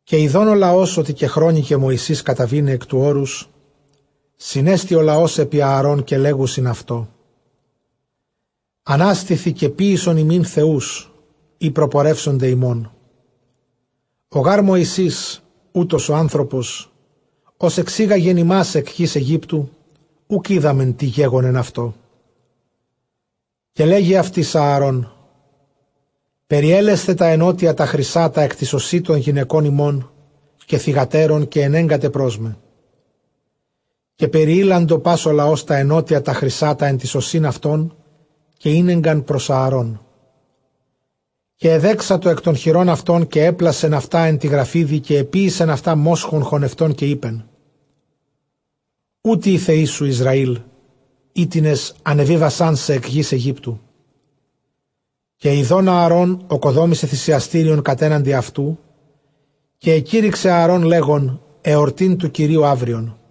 Καὶ ἰδὼν ὁ λαὸς, ὅτι κεχρόνικε Μωυσῆς καταβῆναι ἐκ τοῦ ὄρους, συνέστη ὁ λαὸς ἐπὶ Ἀαρὼν, καὶ λέγουσιν αὐτῷ ἀνάστηθι, καὶ ποίησον ἡμῖν θεοὺς, οἳ προπορεύσονται ἡμῶν· ὁ γὰρ Μωυσῆς οὗτος ὁ ἄνθρωπος ὃς ἐξήγαγεν ἡμᾶς ἐκ γῆς Αἰγύπτου, οὐκ οἴδαμεν τί γέγονεν αὐτῷ. Καὶ λέγει αὐτοῖς Ἀαρὼν Περιέλεσθε τὰ ἐνώτια τὰ χρυσᾶ τὰ ἐν τοῖς ὠσὶ τῶν γυναικῶν ὑμῶν καὶ θυγατέρων, καὶ ἐνέγκατε πρός με. Καὶ περιείλαντο πᾶς ὁ λαὸς τὰ ἐνώτια τὰ χρυσᾶ τὰ ἐν τοῖς ὠσὶν αὐτῶν, καὶ ἤνεγκαν πρὸς Ἀαρών. Καὶ ἐδέξατο ἐκ τῶν χειρῶν αὐτῶν, καὶ ἔπλασεν αὐτὰ ἐν τῇ γραφίδι· καὶ ἐποίησεν αὐτὰ μόσχον χωνευτὸν καὶ εἶπεν, Οὗτοι οἱ θεοί σου Ἰσραὴλ, οἵτινες ἀνεβίβασάν σε ἐκ γῆς Αἰγύπτου. Καὶ ἰδὼν Ἀαρὼν ᾠκοδόμησε θυσιαστήριον κατέναντι αὐτοῦ· καὶ ἐκήρυξεν Ἀαρὼν λέγων, ἑορτὴ τοῦ κυρίου αὔριον.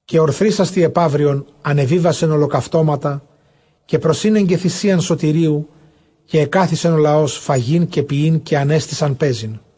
Καὶ ὀρθρίσας τῇ ἐπαύριον ἀνεβίβασεν ὁλοκαυτώματα, καὶ προσήνεγκε θυσίαν σωτηρίου· καὶ ἐκάθισεν ὁ λαὸς φαγεῖν καὶ πιεῖν, καὶ ἀνέστησαν παίζειν.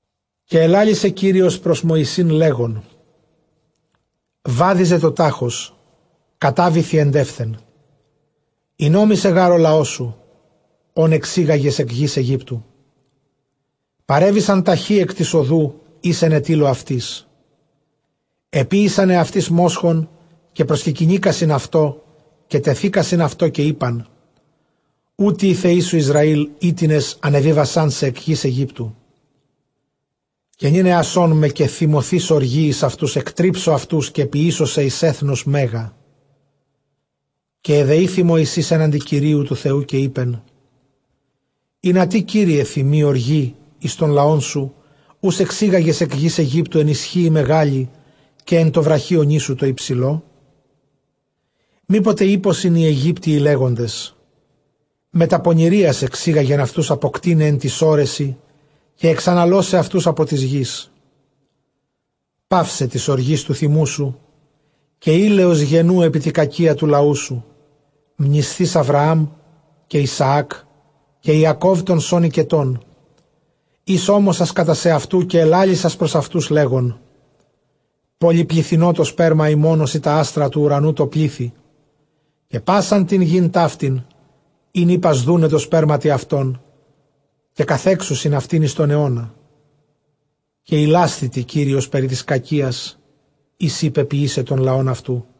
Καὶ ἐλάλησε Κύριος πρὸς Μωυσῆν, λέγων, βάδιζε τὸ τάχος, κατάβηθι ἐντεύθεν· ἠνόμησε γὰρ ὁ λαός σου ὃν ἐξήγαγες ἐκ γῆς Αἰγύπτου. Παρέβησαν ταχὺ ἐκ τῆς ὁδοῦ, ἧς ἐνετείλω αὐτοῖς· ἐποίησαν ἑαυτοῖς μόσχον, καὶ προσκεκυνήκασιν αὐτῷ, καὶ τεθύκασιν αὐτῷ, καὶ εἶπαν, Οὗτοι οἱ θεοί σου Ἰσραὴλ, οἵτινες ἀνεβίβασάν σε ἐκ γῆς Αἰγύπτου. καὶ νῦν ἔασόν με, καὶ θυμωθεὶς ὀργῇ εἰς αὐτοὺς, ἐκτρίψω αὐτούς· καὶ ποιήσω σὲ εἰς ἔθνος μέγα. καὶ ἐδεήθη Μωυσῆς ἔναντι Κυρίου τοῦ Θεοῦ, καὶ εἶπεν, ἱνατί, Κύριε, θυμοῖ ὀργῇ εἰς τὸν λαόν σου, οὓς ἐξήγαγες ἐκ γῆς Αἰγύπτου ἐν ἰσχύϊ μεγάλῃ, καὶ ἐν τῷ βραχίονί σου τῷ ὑψηλῷ; Μή ποτε εἴπωσιν οἱ Αἰγύπτιοι λέγοντες Μετὰ πονηρίας ἐξήγαγεν αὐτοὺς ἀποκτεῖναι ἐν τοῖς ὄρεσιν καὶ ἐξαναλῶσαι αὐτοὺς ἀπὸ τῆς γῆς. παῦσαι τῆς ὀργῆς τοῦ θυμοῦ σου, καὶ ἵλεως γενοῦ ἐπὶ τῇ κακίᾳ τοῦ λαοῦ σου, μνησθεὶς Ἀβραὰμ καὶ Ἰσαὰκ καὶ Ἰακὼβ τῶν σῶν οἰκετῶν, οἷς ὤμοσας κατὰ σεαυτοῦ, καὶ ἐλάλησας πρὸς αὐτοὺς, λέγων, πολυπληθυνῶ τὸ σπέρμα ὑμῶν ὡσεὶ τὰ ἄστρα τοῦ οὐρανοῦ τῷ πλήθει· καὶ πᾶσαν τὴν γῆν ταύτην ἣν εἶπας δοῦναι αὐτοῖς, καὶ καθέξουσιν αὐτὴν εἰς τὸν αἰῶνα. Καὶ ἱλάσθη Κύριος περιποιῆσαι τὸν λαὸν αὐτοῦ.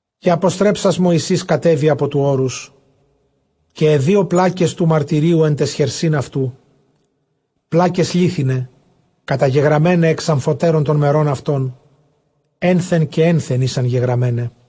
Καὶ ἀποστρέψας Μωυσῆς, κατέβη ἀπὸ τοῦ ὄρους· καὶ αἱ δύο πλάκες τοῦ μαρτυρίου ἐν ταῖς χερσὶν αὐτοῦ, πλάκες λίθιναι καταγεγραμμέναι ἐξ ἀμφοτέρων τῶν μερῶν αὐτῶν, ἔνθεν καὶ ἔνθεν ἦσανς γεγραμμέναι·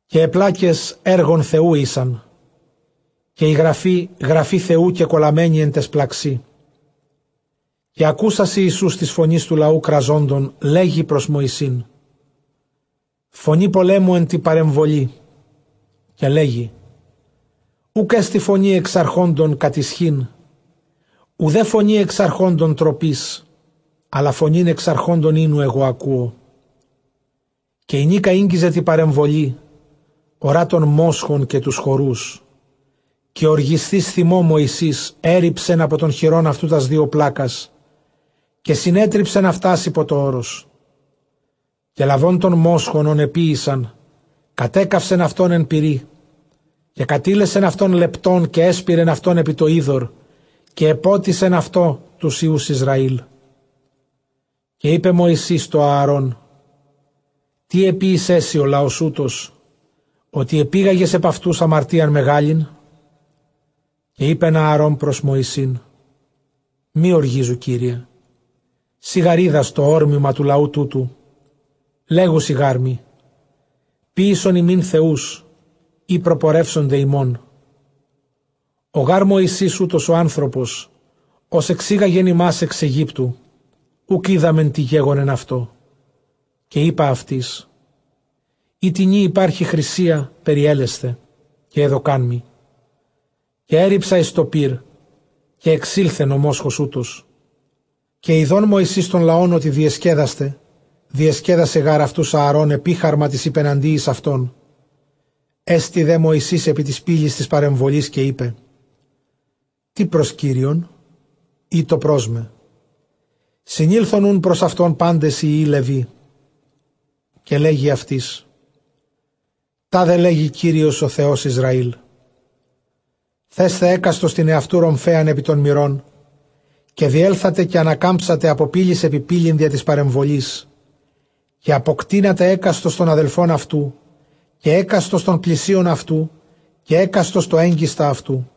καὶ αἱ πλάκες ἔργον Θεοῦ ἦσαν, καὶ ἡ γραφὴ γραφὴ Θεοῦ κεκολαμμένη ἐν ταῖς πλαξί. καὶ ἀκούσας Ἰησοῦς τῆς φωνῆς τοῦ λαοῦ κραζόντων, λέγει πρὸς Μωυσὴν, Φωνὴ πολέμου ἐν τῇ παρεμβολῇ. καὶ λέγει Οὐκ ἔστι φωνὴ ἐξαρχόντων κατʼ ἰσχὺν, οὐδὲ φωνὴ ἐξαρχόντων τροπῆς, ἀλλὰ φωνὴν ἐξαρχόντων οἴνου ἐγὼ ἀκούω. καὶ ἡνίκα ἤγγιζε τῇ παρεμβολῇ, ὁρᾷ τὸν μόσχον καὶ τοὺς χορούς· καὶ ὀργισθεὶς θυμῷ Μωυσῆς ἔῤῥιψεν ἀπὸ τῶν χειρῶν αὐτοῦ τὰς δύο πλάκας, καὶ συνέτριψεν αὐτὰς ὑπὸ τὸ ὄρος· καὶ λαβὼν τὸν μόσχον ὃν ἐποίησαν, κατέκαυσεν αὐτὸν ἐν πυρὶ, καὶ κατήλεσεν αὐτὸν λεπτὸν, καὶ ἔσπειρεν αὐτὸν ὑπὸ τὸ ὕδωρ, καὶ ἐπότισεν αὐτὸ τοὺς υἱοὺς Ἰσραήλ. καὶ εἶπε Μωυσῆς τῷ Ἀαρὼν, Τί ἐποίησέ σοι ὁ λαὸς οὗτος, ὅτι ἐπήγαγες ἐπʼ αὐτοὺς ἁμαρτίαν μεγάλην; καὶ εἶπεν Ἀαρὼν πρὸς Μωυσῆν, μὴ ὀργίζου, κύριε· σὺ γὰρ οἶδας τὸ ὅρμημα τοῦ λαοῦ τούτου. Λέγουσι γάρ μοι, ποιήσον ἡμῖν θεοὺς, οἳ προπορεύσονται ἡμῶν· ὁ γὰρ Μωυσῆς οὗτος ὁ ἄνθρωπος, ὃς ἐξήγαγεν ἡμᾶς ἐξ Αἰγύπτου, οὐκ οἴδαμεν τί γέγονεν αὐτῷ. καὶ εἶπα αὐτοῖς, εἴ τινι ὑπάρχει χρυσία, περιέλεσθε· καὶ ἔδωκάν μοι· καὶ ἔῤῥιψα εἰς τὸ πῦρ· καὶ ἐξῆλθεν ὁ μόσχος οὗτος. Καὶ ἰδὼν Μωυσῆς τὸν λαὸν ὅτι διεσκέδασται· (διεσκέδασε γὰρ αὐτοὺς Ἀαρών ἐπίχαρμα τοῖς ὑπεναντίοις αὐτῶν) ἔστη δὲ Μωυσῆς ἑπὶ τῆς πύλης τῆς παρεμβολῆς, καὶ εἶπε, τίς πρὸς Κύριον; ἴτω πρός με. Συνῆλθον οὖν πρὸς αὐτὸν πάντες οἱ υἱοὶ Λευί. Καὶ λέγει αὐτοῖς τάδε λέγει Κύριος ὁ Θεὸς Ἰσραήλ θέσθε ἕκαστος τὴν ἑαυτοῦ ῥομφαίανν ἐπὶ τὸν μηρὸν, καὶ διέλθατε καὶ ἀνακάμψατε ἀπὸ πύλης ἐπὶ πύλην διὰ τῆς παρεμβολῆς, καὶ ἀποκτείνατε ἕκαστος τὸν ἀδελφὸν αὐτοῦ, καὶ ἕκαστος τὸν πλησίον αὐτοῦ, καὶ ἓκαστος τὸν ἔγγιστα αὐτοῦ.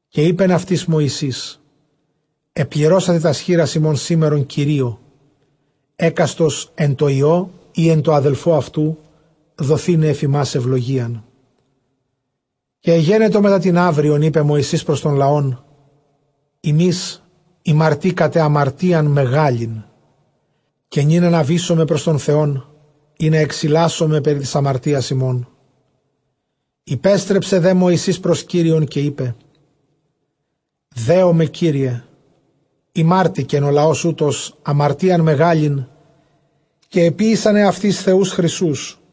Καὶ εἶπεν αὐτοῖς Μωυσῆς, ἐπληρώσατε τὰς χεῖρας ὑμῶν σήμερον Κυρίῳ ἕκαστος ἐν τῷ υἱῷ ἢ ἐν τῷ ἀδελφῷ αὐτοῦ, δοθῆναι ἐφʼ ὑμᾶς εὐλογίαν. Καὶ ἐγένετο μετὰ τὴν αὔριον εἶπε Μωυσῆς πρὸς τὸν λαὸν, ὑμεῖς ἡμαρτήκατε ἁμαρτίαν μεγάλη· καὶ νῦν ἀναβήσομαι πρὸς τὸν Θεὸν, ἵνα ἐξιλάσωμαι περὶ τῆς ἁμαρτίας ὑμῶν. Ὑπέστρεψε δὲ Μωυσῆς πρὸς Κύριον, καὶ εἶπε, δέομαι, κύριε· ἡμάρτηκεν ὁ λαὸς οὗτος ἁμαρτίαν μεγάλην, καὶ ἐποίησαν ἑαυτοῖς θεοὺς χρυσοῦς.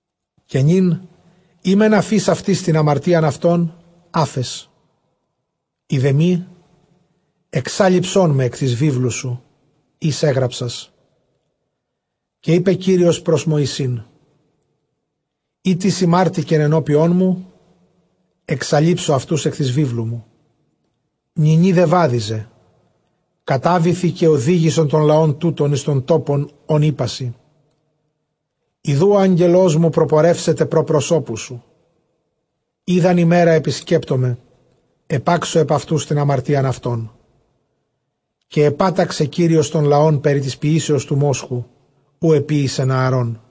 Καὶ νῦν εἰ μὲν ἀφεῖς αὐτοῖς τὴν ἁμαρτίαν αὐτῶν, ἄφες· εἰ δὲ μή, ἐξάλειψόν με ἐκ τῆς βίβλου σου, ἧς ἔγραψας. Καὶ εἶπε Κύριος πρὸς Μωυσῆν, εἴ τις ἡμάρτηκεν ἐνώπιόν μου, ἐξαλείψω αὐτοὺς ἐκ τῆς βίβλου μου. Νυνὶ δὲ βάδιζε, κατάβηθι, καὶ ὁδήγησον τὸν λαὸν τοῦτον εἰς τὸν τόπον, ὃν εἶπά σοι· ἰδοὺ ὁ ἄγγελός μου προπορεύσεται πρὸ προσώπου σου· ᾖ δʼ ἂν ἡμέρᾳ ἐπισκέπτωμαι, ἐπάξω ἐπʼ αὐτοὺς τὴν ἁμαρτίαν αὐτῶν Καὶ ἐπάταξε Κύριος τὸν λαὸν περὶ τῆς ποιήσεως τοῦ μόσχου, οὗ ἐποίησεν Ἀαρών.